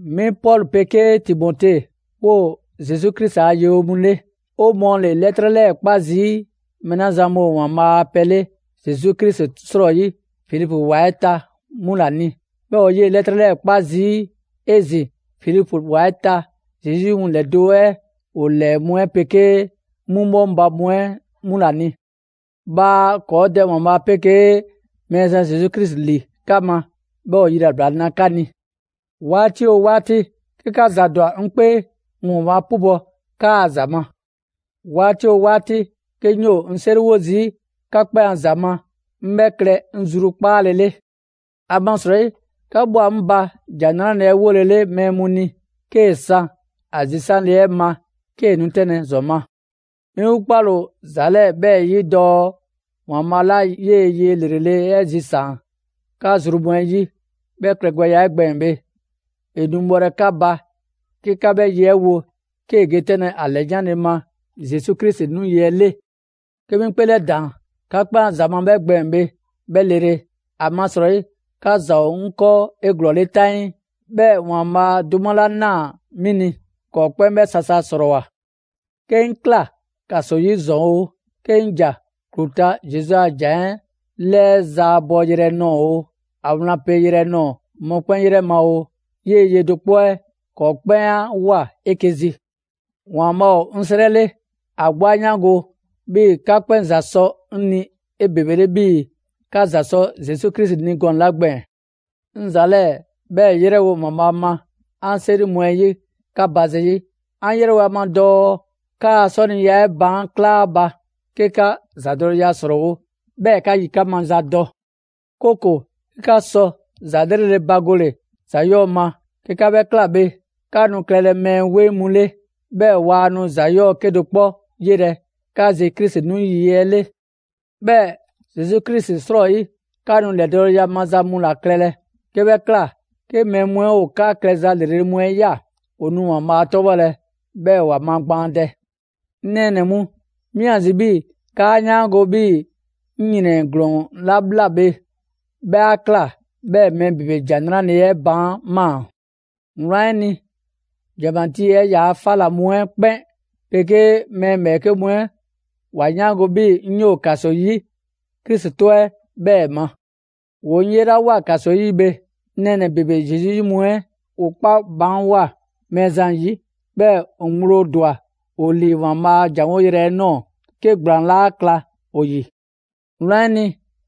Mi Pɔlu 'pegee Timote 'woo‑ Zesu Krisi a yewonɛ mu 'le. 'O mɔɔ ‑le 'lɛtrɛ 'lɛɛ‑ 'kpa zii' mɛɛ 'la zan mu ‑o ‑Waanbhaa' a pɛ 'le Zesu Krisi 'srɔyi Filipu ‑wa 'ɛ ta 'mu ‑la ni. 'Bhɛɛ‑ 'o 'yee‑ 'lɛtrɛ 'lɛɛ 'kpa zii' 'ezin‑ Filipu ‑wa 'ɛ ta Zesu 'yi mu ‑lɛdo' 'ɛ ‑o ‑lɛɛ mu 'ɛ 'pegee 'mu 'bhɔŋba‑ mu 'ɛ 'mu ‑la ni. Bhaa ‑kɔɔ' Dɛ ‑Waanbhaa' 'pegee Mɛɛzan Zesu Krisi ‑li 'ka ma, 'bhɛɛ‑ ‑o yilabla na 'ka ni. 'Waati 'oo 'waati, 'ke 'ka ‑za ‑dwa 'ŋ 'kpee, 'ŋ ‑Waanbhaa' 'pubɔ‑ 'kaa‑ ‑za ma. 'Waati 'oo 'waati, 'ke 'ŋ 'yoo 'ŋ 'seriwo zii' 'ka 'kpɛn a ‑za ma, 'ŋ 'bhɛ klɛ 'ŋ zrukpaale 'le. ‑Amasrɔyi 'ka ꞊bhwa 'ŋ ba ‑Jan 'Nrale‑ 'ɛ 'wole 'le mɛɛ mu ni, 'kee‑ san ‑a zisanle 'ɛ ma, 'kee‑ nu 'tɛnlɛ‑ ‑zɔn ma. 'Mi 'gbu 'kpale‑ ‑o ‑za 'lɛɛ‑ 'bhɛɛ‑ 'yi dɔɔ ‑Waanbhaa' 'la 'yee‑ ye ‑lrele' 'ɛ zisaan‑ 'ka zru mu 'ɛ 'yi 'bhɛ klɛgbɛya 'ɛ gbɛɛn‑ bhe, ‑e nu bhɔlɛ 'ka ba 'ke 'ka 'bhɛ ye 'ɛ wo 'kee‑ ge 'tɛnlɛ‑ ‑a ‑lɛyanle ma Zesu Krisi 'nu yi 'ɛ 'le. 'Ke 'mi 'ŋ 'kpeelɛdaan 'ka 'kpɛn ‑a ‑za ma 'bhɛ gbɛɛn‑ bhe 'bhɛ lele. ‑Amasrɔyi 'ka ‑za ‑o 'ŋ 'kɔɔ 'eglɔɔle 'taŋii. 'Bhɛɛ‑ ‑Waanbhaa' 'duma 'la 'naa‑ 'mi ni, ‑kɔɔ 'kpɛn 'bhɛ sasa ‑srɔɔwoa. 'Ke 'ŋ ꞊kla ‑kaso 'yi ‑zɔn oo, 'ke 'ŋ ‑ja ‑klu ta Zesu a ‑jan 'ɛ 'lɛɛ zaabɔ yrɛ nɔɔ‑ oo, ‑a wlan pe yrɛ nɔɔ‑ mɔkpɛn' 'yrɛ ma oo, 'yee‑ ye do 'kpɔ 'ɛ ‑kɔɔ 'kpɛn 'a ꞊woa 'eke‑ zi. ‑Waanbhaa' ‑o 'ŋ 'srɛ 'le, ‑a 'gbu 'a 'yaango‑ 'bhii‑ 'ka 'kpɛn ‑za sɔ 'ŋ ni 'ebebele 'bhii‑ 'ka ‑za sɔ Zesu Krisi ni gɔnɛ‑ 'la gbɛɛn‑. 'Ŋ ‑za 'lɛɛ‑ 'bhɛɛ‑ 'yrɛwo‑ ‑Waanbhaa ma 'an 'seri mu 'ɛ 'yi 'ka ba zayi', 'an 'yrɛwo‑ ‑a ma dɔɔ 'kaa‑ 'sɔniya 'ɛ baan' kla ‑a ba, 'ke 'ka ‑zadɔleya ‑srɔɔwo', 'bhɛɛ‑ 'ka yikan' maza dɔ. 'Kooko‑ 'ke 'ka sɔ ‑za 'lrele‑ bagole ‑za 'yɔɔ‑ ma. 'Ke 'ka 'bhɛ ꞊kla bhe, 'ka nu klɛlɛ mɛɛ 'weŋ mu 'le, 'bhɛɛ‑ waa nu ‑za 'yɔɔ‑ 'kedo‑ 'kpɔ 'yelɛ‑ 'ka zi Krisi 'nu yi 'ɛ 'le. 'Bhɛɛ‑ Zesu Krisi 'srɔyi, 'ka nu ‑lɛdɔɔleya maza mu ‑la klɛlɛ. 'Ke 'bhɛ ꞊kla, 'ke mɛɛ mu 'ɛ ‑o 'ka klɛza ‑lrele' mu 'ɛ ꞊ya, ‑o nu ‑Waanbhaa' 'tɔbhɔlɛ, 'bhɛɛ‑ ‑wa magbaandɛ. 'Ŋ nɛɛnɛ‑ mu, 'mi ‑a zi 'bhii‑ 'kaa 'yaango‑ 'bhii‑ 'ŋ ‑yrɛn ‑glɔɔn 'la ꞊bhla bhe, 'bhɛ 'a ꞊kla 'bhɛɛ‑ mɛɛ ‑bebe ‑Jan 'Nrale‑ 'ɛ baan' ꞊maa. Wlan 'ɛ ni, ‑janmatii 'ɛ ‑yaa 'fa ꞊la mu 'ɛ 'kpɛn 'pegee mɛɛ ‑bhɛɛke' mu 'ɛ ‑wa 'yaango‑ 'bhii‑ 'ŋ 'yoo‑ ‑kaso 'yi Krisi 'tɔ 'ɛ 'bhɛɛ‑ ma. ‑Woo 'ŋ 'yelawoa ‑kaso 'yi bhe, 'ŋ nɛɛnɛ‑ ‑bebe Zesu 'yi mu 'ɛ ‑woo 'kpa baanwoa‑ Mɛɛzan 'yi. 'Bhɛɛ‑ ‑o ŋgblo ‑dwa ‑o ‑lii ‑Waanbhaa' ‑jan 'woyrɛ‑ 'ɛ ꞊nɔɔ, 'ke ‑gblaan 'laa kla ‑o ‑yi. Wlan 'ɛ ni,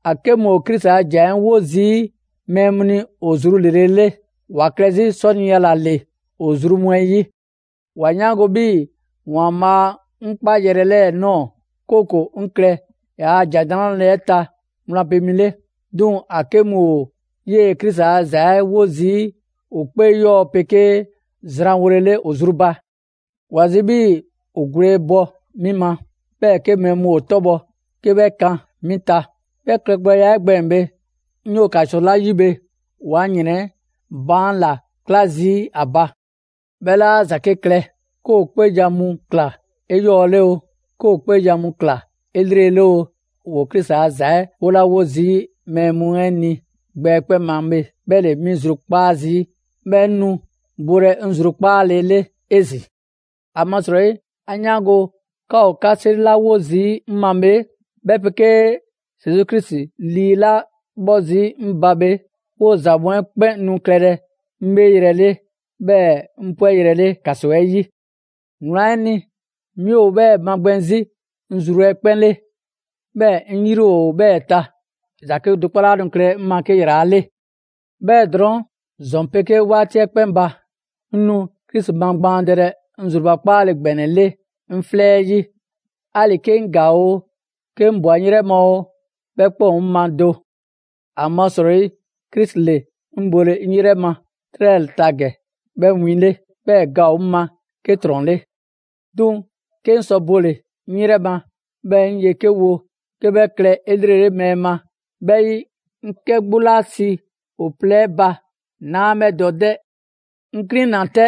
‑a 'ke mu ‑o Krisi a ‑jan 'ɛ wo zii' mɛɛ mu ni ‑o zru ‑lrele' 'le, ‑wa klɛ 'zi 'sɔniya ‑la ‑le ‑o zru mu 'ɛ 'yi. ‑Wa 'yaango‑ 'bhii‑ ‑Waanbhaa' 'ŋ ꞊kpaa 'ŋ 'kpayrɛ‑ 'lɛɛ‑ ꞊nɔɔ, 'kooko‑ 'ŋ klɛ ‑yaa' ‑Jan 'Nrale‑ 'ɛ ta wlan pe mi 'le. 'Duŋ‑ ‑a 'ke mu ‑o 'yee‑ Krisi a ‑za 'ɛ 'wo zii' ‑o 'kpee 'yɔɔ‑ 'pegee zranwolele ‑o zru ba. ‑Wa zi 'bhii‑ ‑o gwle bɔ 'mi ma, 'bhɛɛ‑ 'ke mɛɛ mu ‑o 'tɔbhɔ‑ 'ke 'bhɛ kan 'mi ta. 'Bhɛ klɛgbɛya 'ɛ gbɛɛn‑ bhe, 'ŋ 'yoo‑ ‑kaso 'la 'yi bhe, ‑woo 'an ‑yrɛn 'ɛ baan' ‑la 'kla zii' 'a ba. 'Bhɛ 'laa ‑za 'ke klɛ. 'Ke ‑o 'kpeejan‑ mu ꞊kla 'eyɔɔle oo, 'ke ‑o 'kpeejan‑ mu ꞊kla 'elrele oo, ‑woo Krisi a ‑za 'ɛ 'wolawo zii' mɛɛ mu 'ɛ ni gbɛ 'ɛ 'kpɛn ma bhe 'bhɛ ‑le 'mi zrukpaa' zii'. 'Bhɛɛ‑ 'ŋ nu bolɛ 'ŋ zrukpaale 'le 'ezin‑. ‑Amasrɔyi 'an 'yaango‑ 'ka ‑o 'ka 'seri mu 'la 'wo zii' 'ŋ ma bhe, 'bhɛ 'pegee Zesu Krisi Lii 'la 'bhɔ zii' 'ŋ ba bhe, 'woo‑ ‑za mu 'ɛ 'kpɛn nu klɛlɛ 'ŋ 'bheeyrɛ‑ 'le, 'bhɛɛ‑ 'ŋ 'pwɛyrɛ‑ 'le ‑kaso 'ɛ 'yi. Wlan 'ɛ ni, 'mi ‑o 'bhɛɛ‑ magbɛn 'zi 'ŋ zru 'ɛ 'kpɛn 'le, 'bhɛɛ‑ 'ŋ 'yri ‑o 'bhɛɛ‑ ta. ‑Za 'kedo‑ 'kpɔ 'laa nu klɛlɛ 'ŋ ma 'ke ‑yrala' 'le. 'Bhɛɛ‑ drɔɔn', ‑zɔn 'pegee 'waati 'ɛ 'kpɛn ba, 'ŋ nu Krisi magbaandɛlɛ 'ŋ zrubakpaale ‑gbɛnɛ 'le 'ŋ 'flɛ 'ɛ 'yi, 'ali‑ 'ke 'ŋ ‑gaa oo, 'ke 'ŋ ꞊bwa 'ŋ 'yrɛ ma oo, 'bhɛ 'kpɛn ‑o 'ŋ ma do. ‑Amasrɔyi Krisi ‑le 'ŋ bole 'ŋ 'yrɛ ma 'trɛ 'lɛɛ‑ ta ‑gɛ 'bhɛ 'win 'le, 'bhɛɛ‑ ga ‑o 'ŋ ma 'ke ‑trɔn 'le. 'Duŋ‑ 'ke 'ŋ sɔ bole 'ŋ 'yrɛ ma, 'bhɛɛ‑ 'ŋ ye 'ke wo 'ke 'bhɛ klɛ 'elrele mɛɛ ma, 'bhɛ 'yi, 'ŋ 'kɛ 'gbu 'la si ‑o plɛ 'ɛ ba 'naa 'bhɛ dɔ 'dɛ. 'Ŋ 'klina‑ 'tɛ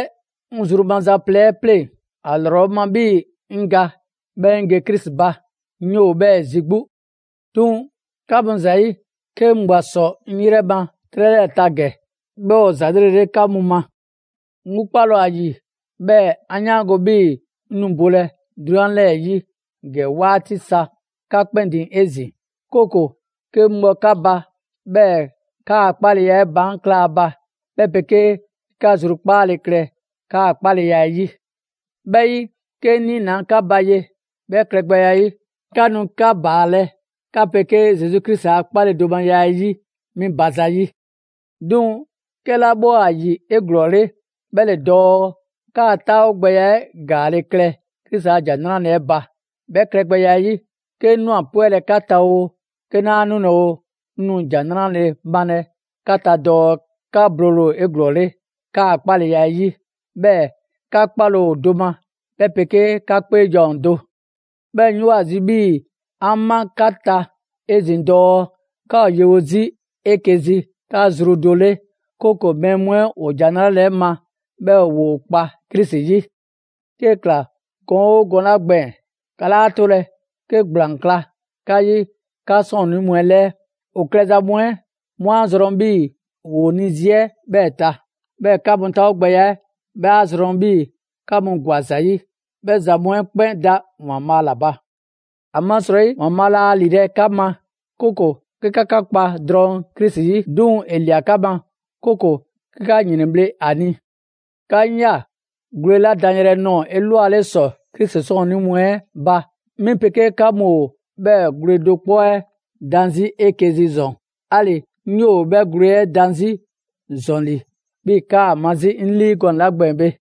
'ŋ zru maza plɛ 'ɛ pleŋ‑: ‑A ‑lrɔ 'ŋ ma 'bhii‑ 'ŋ ga 'bhɛɛ‑ 'ŋ ge Krisi ba. 'Ŋ 'yoo‑ 'bhɛɛ‑ zi 'gbu. 'Duŋ‑ 'ka mu ‑za 'yi, 'ke 'ŋ ꞊bwa ‑sɔ 'ŋ 'yrɛ ma 'trɛ 'lɛɛ‑ ta ‑gɛ, 'bhɛ ‑o ‑za 'lrele‑ 'le 'ka mu ma. 'Ŋ 'gbu 'kpale ‑o ‑a ‑yi, 'bhɛɛ‑ 'an 'yaango‑ 'bhii‑ 'ŋ nu bolɛ 'drunyan 'lɛɛ‑ 'yi ‑gɛ 'waati sa 'ka 'kpɛn ‑din 'ezin‑. 'Kooko‑ 'ke 'ŋ bhɔ 'ka ba, 'bhɛɛ‑ 'kaa‑ 'kpaleya 'ɛ baan' kla ‑a ba, 'bhɛ 'pegee 'ke 'ka zrukpaale klɛ 'kaa‑ 'kpaleya 'ɛ 'yi. 'Bhɛ 'yi, 'ke 'ŋ 'niinaa 'ka ba ye, 'bhɛ klɛgbɛya 'ɛ 'yi, 'ka nu 'ka ‑baalɛ' 'ka 'pegee Zesu Krisi a 'kpaledomaya 'ɛ 'yi 'mi ba zayi'. 'Duŋ‑ 'kɛla 'bhɛ ‑o ‑a ‑yi 'eglɔɔle, 'bhɛ ‑le dɔɔ 'kaa 'taawogbɛya 'ɛ ‑gaale' klɛ Krisi ‑a ‑Jan 'Nrale‑ 'ɛ ba. 'Bhɛ klɛgbɛya 'ɛ 'yi, 'ke 'ŋ ꞊nwa 'pwɛlɛ‑ 'ka ta oo, 'ke 'naa 'nulɛ‑ oo, 'ŋ nu ‑jan 'nrale‑ malɛ 'ka ta dɔɔ 'ka bole ‑o 'eglɔɔle 'kaa‑ 'kpaleya 'ɛ 'yi, 'bhɛɛ‑ 'ka 'kpale‑ ‑o do ma, 'bhɛ 'pegee 'ka 'kpeejan‑ ‑o do. 'Bhɛɛ‑ 'ŋ 'yoo‑ ‑a zi 'bhii‑ 'an ma 'ka ta 'ezin‑ dɔɔ 'ka ‑o yewo 'zi 'eke‑ zi 'ka zru do 'le, 'kooko‑ mɛɛ mu 'ɛ ‑o ‑Jan 'Nrale‑ 'ɛ ma 'bhɛɛ‑ ‑woo kpa Krisi 'yi. 'Kee‑ ꞊kla gɔn 'oo gɔnɛ‑ 'la gbɛɛn‑, 'ka 'laa 'tolɛ‑ 'ke ‑gblaan kla 'ka 'yi 'ka 'sɔɔnnii mu 'ɛ 'lɛɛ. ‑O klɛza mu 'ɛ 'mu a zrɔn 'bhii‑ ‑woo ‑o ni zi 'ɛ 'bhɛɛ‑ ta, 'bhɛɛ‑ 'ka mu 'taawogbɛya 'ɛ 'bhɛ 'a zrɔn 'bhii‑ 'ka mu ‑gwa ‑za 'yi. 'Bhɛ ‑za mu 'ɛ 'kpɛn da ‑Waanbhaa' ‑la ba. ‑Amasrɔyi ‑Waanbhaa' laa ‑lilɛ' 'ka ma, 'kooko‑ 'ke 'ka 'ka kpa drɔŋ Krisi 'yi, 'duŋ‑ ‑e ‑lia 'ka ma, 'kooko‑ 'ke 'ka ‑yrɛnbhle' ‑a ni. 'Ka 'ŋ ꞊ya gwle 'la dan yrɛ nɔɔ‑ 'elwale ‑sɔ Krisi 'sɔɔnnii mu 'ɛ ba, 'mi 'pegee 'ka mu ‑o 'bhɛɛ‑ gwle do 'kpɔ 'ɛ dan 'zi 'eke‑ zi ‑zɔn; 'ali‑ 'ŋ 'yoo‑ 'bhɛɛ‑ gwle 'ɛ dan 'zi ‑zɔn ‑li 'bhii‑ 'kaa‑ ma 'zi 'ŋ 'lii gɔnɛ‑ 'la gbɛɛn‑ bhe.